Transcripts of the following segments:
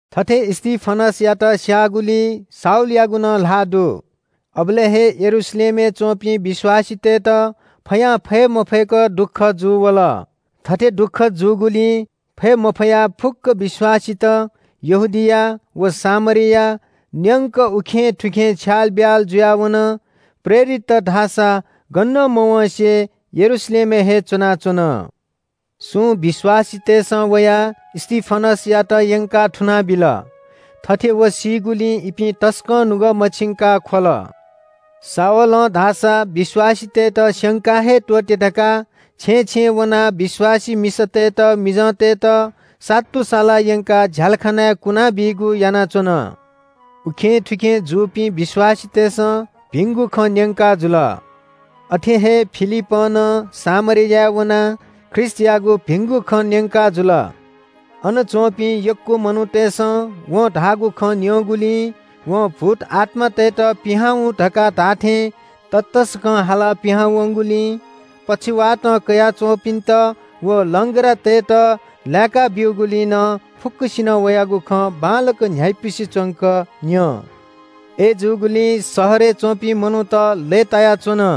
थथे स्‍तिफनसयात स्‍याःगुलिइ शाऊलयागु नं ल्‍हाः दु। अबलय् हे यरूशलेमय् च्‍वंपिं विश्‍वासीतय्‌त फयां फये मफय्‌क दुःख जूवल। थथे दुःख जूगुलिं फये मफयाः फुक्‍क विश्‍वासीत यहूदिया व सामरिया न्‍यंक उखेंथुखें छ्यालब्‍याल जुयाः वन। प्रेरितत धाःसा गनं मवँसे यरूशलेमय् हे च्‍वनाच्‍वन। सुं विश्‍वासीतय्‌सं वयाः स्‍तिफनसयात यंकाः थुनाबिल। थथे व सीगुलिं इपिं तसकं नुगः मछिंकाः ख्‍वल। शाऊलं धाःसा विश्‍वासीतय्‌त स्‍यंका हे त्‍वःते धकाः छेँय् छेँय् वनाः विश्‍वासी मिसातय्‌त मिजंतय्‌त सातुसालाः यंकाः झ्‍यालखानाय् कुना बीगु यानाच्‍वन। उखेंथुखें जूपिं विश्‍वासीतय्‌सं भिंगु खँ न्‍यंकाजुल। अथे हे फिलिपं नं सामरियाय् वनाः ख्रीष्‍टयागु भिंगु खँ न्‍यंकाजुल। अन च्‍वंपिं यक्‍व मनूतय्‌सं वं धाःगु खँ न्‍यंगुलिं, वं भूतआत्‍मातय्‌त पिहां हुँ धकाः धाःथें ततःसकं हालाः पिहां वंगुलिं, पक्षवातं कयाः च्‍वंपिन्‍त व लंग्रातय्‌त लाय्‌का ब्‍यूगुलिं नं फुक्‍कसिनं वयागु खँ बांलाक न्‍ह्याइपुसे च्‍वंक न्‍यं। अय्‌जूगुलिं शहरय् च्‍वंपिं मनूत लय्‌तायाच्‍वन।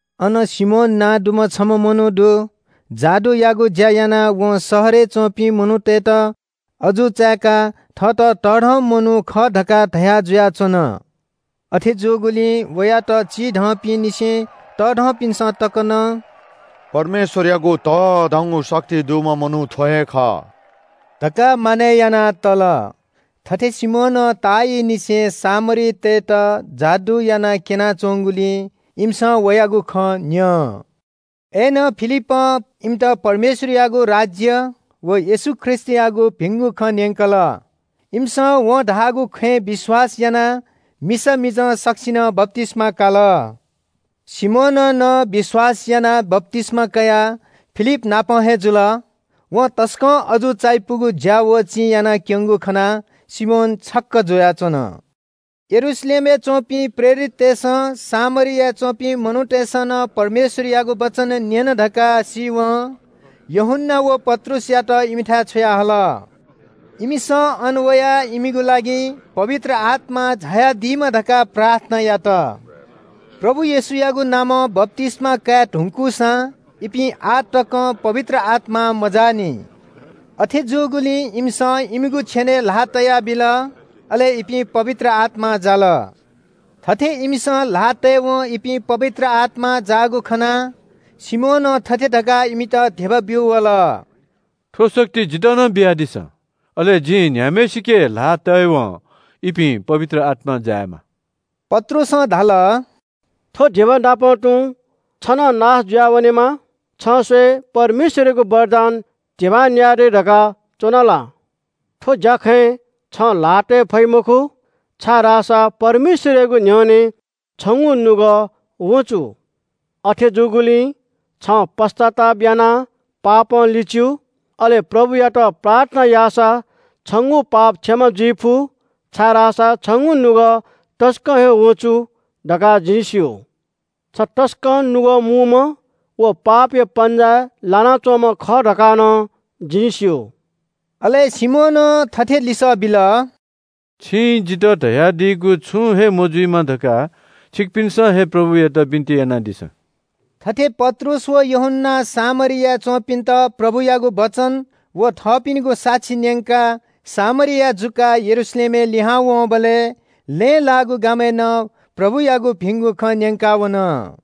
अन सिमोन नां दुम्‍ह छम्‍ह मनू दु। जादुयागु ज्‍या यानाः वं शहरय् च्‍वंपिं मनूतय्‌त अजू चाय्‌काः थःत तःधंम्‍ह मनू खः धकाः धया जुयाच्‍वन। अथे जूगुलिं वयात चिधंपिंनिसें तःधंपिन्‍सं तक नं – “परमेश्‍वरयागु तःधंगु शक्ति दुम्‍ह मनू थ्‍व हे खः” धकाः मानय् याना तल। थथे सिमोनं ताःइलंनिसें सामरीतय्‌त जादु याना क्‍यनाच्‍वंगुलिं इमिसं वयागु खँ न्‍यं। अय्‌नं फिलिपं इमित परमेश्‍वरयागु राज्‍य व येशू ख्रीष्‍टयागु भिंगु खँ न्‍यंकल। इमिसं वं धाःगु खँय् विश्‍वास यानाः मिसा मिजं सकसिनं बप्‍तिस्‍मा काल। सिमोनं नं विश्‍वास यानाः बप्‍तिस्‍मा कयाः फिलिप नाप हे जुल। वं तसकं अजू चायापुगु ज्‍या व चिं यानाक्‍यंगु खनाः सिमोन छक्‍क जुयाच्‍वन। यरूशलेमय् च्‍वंपिं प्रेरिततय्‌सं सामरियाय् च्‍वंपिं मनूतय्‌सं नं परमेश्‍वरयागु वचन न्‍यन धकाः सीवं यूहन्‍ना व पत्रुसयात इमिथाय् छ्वयाहल। इमिसं अन वयाः इमिगु लागि पवित्र आत्‍मा झायादीमा धकाः प्रार्थना यात। प्रभु येशूयागु नामं बप्‍तिस्‍मा काये धुंकूसां इपिं आः तकं पवित्र आत्‍मां मजाःनि। अथे जूगुलिं इमिसं इमिगु छेनय् ल्‍हाः तयाबिल, अले इपिं पवित्र आत्‍मां जाल। थथे इमिसं ल्‍हाः तयेवं इपिं पवित्र आत्‍मां जाःगु खनाः सिमोनं थथे धकाः इमित धिबा ब्‍यू वल – “थ्‍व शक्ति जितः नं बियादिसँ। अले जिं न्‍ह्याम्‍हय्‌सिके ल्‍हाः तयेवं इपिं पवित्र आत्‍मां जायेमा।” पत्रुसं धाल – “थ्‍व धिबानापं तुं छ नं नाश जुयावनेमा। छं स्‍वये परमेश्‍वरयागु वरदान धिबां न्‍याये दइ धकाः च्‍वना ला? थ्‍व ज्‍याखँय् छं ल्‍हाः तये फइ मखु, छाय्‌धाःसा परमेश्‍वरयागु न्‍ह्यःने छंगु नुगः वँचु। अथे जूगुलिं छं पश्‍चाताप यानाः पापं लिच्‍यु। अले प्रभुयात प्रार्थना याःसा छंगु पाप क्षमा जुइफु, छाय्‌धाःसा छंगु नुगः तसकं हे वँचु धकाः जिं स्‍यू। छ तसकं नुगः मूम्‍ह व पापया पन्‍जाय् लानाच्‍वंम्‍ह खः धकाः नं जिं स्‍यू।” अले सिमोनं थथे लिसः बिल – “छिं जितः धयादीगु छुं हे मजुइमा धकाः छिकपिन्‍सं हे प्रभुयात बिन्‍ति यानादिसँ।” थथे पत्रुस व यूहन्‍नां सामरियाय् च्‍वंपिन्‍त प्रभुयागु वचन व थःपिनिगु साक्षी न्‍यंकाः सामरिया जुकाः यरूशलेम लिहां वंबलय् लँय् लाःगु गामय् नं प्रभुयागु भिंगु खँ न्‍यंका वन।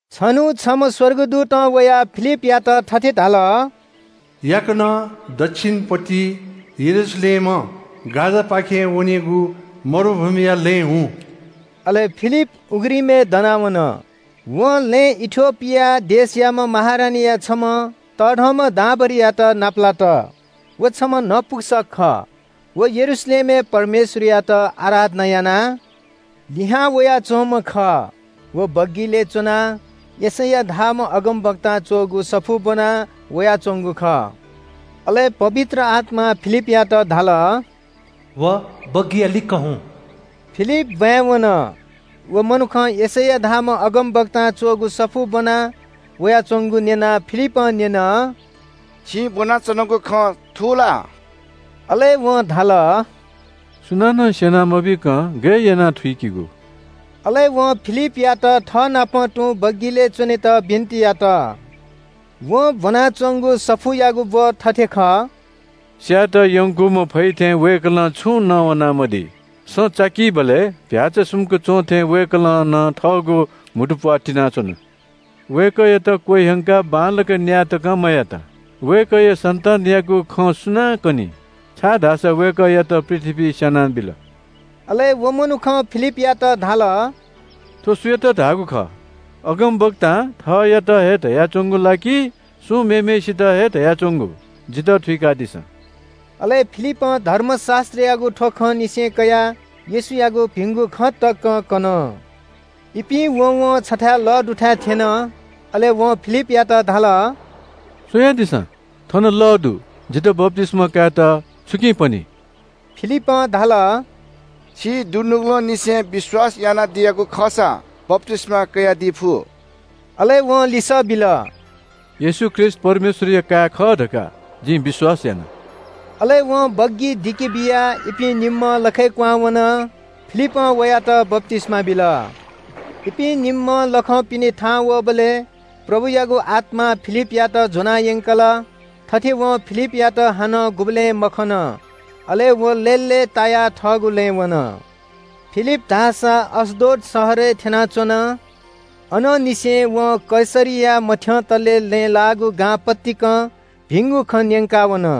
छन्‍हु छम्‍ह स्‍वर्गदूतं वयाः फिलिपयात थथे धाल – “याकनं दच्‍छिन पतिइ यरूशलेमं गाजापाखे वनेगु मरुभूमिया लँय् हुँ।” अले फिलिप उघ्रिमय् दनाः वन। वं लँय् इथियोपिया देशयाम्‍ह महारानीया छम्‍ह तःधंम्‍ह दांभरिंयात नापलात। व छम्‍ह नपुंसक खः। व यरूशलेमय् परमेश्‍वरयात आराधना यानाः लिहां वयाच्‍वंम्‍ह खः। व बग्‍गिलय् च्‍वनाः यशैया धाःम्‍ह अगमवक्तां च्‍वःगु सफू ब्‍वना वयाच्‍वंगु खः। अले पवित्र आत्‍मां फिलिपयात धाल – “व बग्‍गिया लिक्‍क हुँ।” फिलिप ब्‍वाँय् वन, व मनुखं यशैया धाःम्‍ह अगमवक्तां च्‍वःगु सफू ब्‍वना वयाच्‍वंगु न्‍यनाः फिलिपं न्‍यन – “छिं ब्‍वनाच्‍वनागु खँ थू ला?” अले वं धाल – “सुनानं स्‍यना मबीकं गय् यानाः थुइकेगु?” अले वं फिलिपयात थःनाप तुं बग्‍गिलय् च्‍वनेत बिन्‍ति यात। वं ब्‍वनाच्‍वंगु सफूयागु ब्‍व थथे खः – “स्‍यायेत यंकूम्‍ह चीधिकःम्‍ह भ्‍याःचा थें वय्‌कलं छुं नवाना मदी। सँ चाकीबलय् फै सुम्‍क च्‍वंथें वय्‌कलं नं थःगु म्‍हुतुप्‍वाः तिनाच्‍वन। वय्‌कःयात क्‍वह्यंकाः बांलाक न्‍याय तकं मयात। वय्‌कःया सन्‍तानयागु खँ सुनां कनी? छाय्‌धाःसा वय्‌कःयात पृथ्‍वीइ स्‍यानाबिल।” अले व मनुखं फिलिपयात धाल – “थ्‍व सुयात धाःगु खः? अगमवक्तां थःत हे धयाच्‍वंगु ला कि सुं मेम्‍हय्‌सित हे धयाच्‍वंगु? जितः थुइकादिसँ।” अले फिलिपं धर्मशास्‍त्रयागु थ्‍व खंनिसें कयाः येशूयागु भिंगु खँ तक कन। इपिं वँवं छथाय् लः दुथाय् थ्‍यन। अले वं फिलिपयात धाल – “स्‍वयादिसँ, थन लः दु। जितः बप्‍तिस्‍मा कायेत छुकिं पनी?” फिलिपं धाल – “छिं दुनुगलंनिसें विश्‍वास यानादियागु खःसा बप्‍तिस्‍मा कयादी फु।” अले वं लिसः बिल – “येशू ख्रीष्‍ट परमेश्‍वरया काय् खः धकाः जिं विश्‍वास याना।” अले वं बग्‍गी दिके बियाः इपिं निम्‍हं लखय् क्‍वहां वन। फिलिपं वयात बप्‍तिस्‍मा बिल। इपिं निम्‍हं लखं पिने थाहां वःबलय् प्रभुयागु आत्‍मां फिलिपयात ज्‍वना यंकल। थथे वं फिलिपयात हानं गुबलें मखन। अले व लय्‌लय्‌तायाः थःगु लँय् वन। फिलिप धाःसा अश्‍दोद शहरय् थ्‍यनाच्‍वन। अनंनिसें वं कैसरिया मथ्‍यंतले लँय् लाःगु गां पतिकं भिंगु खँ न्‍यंका वन।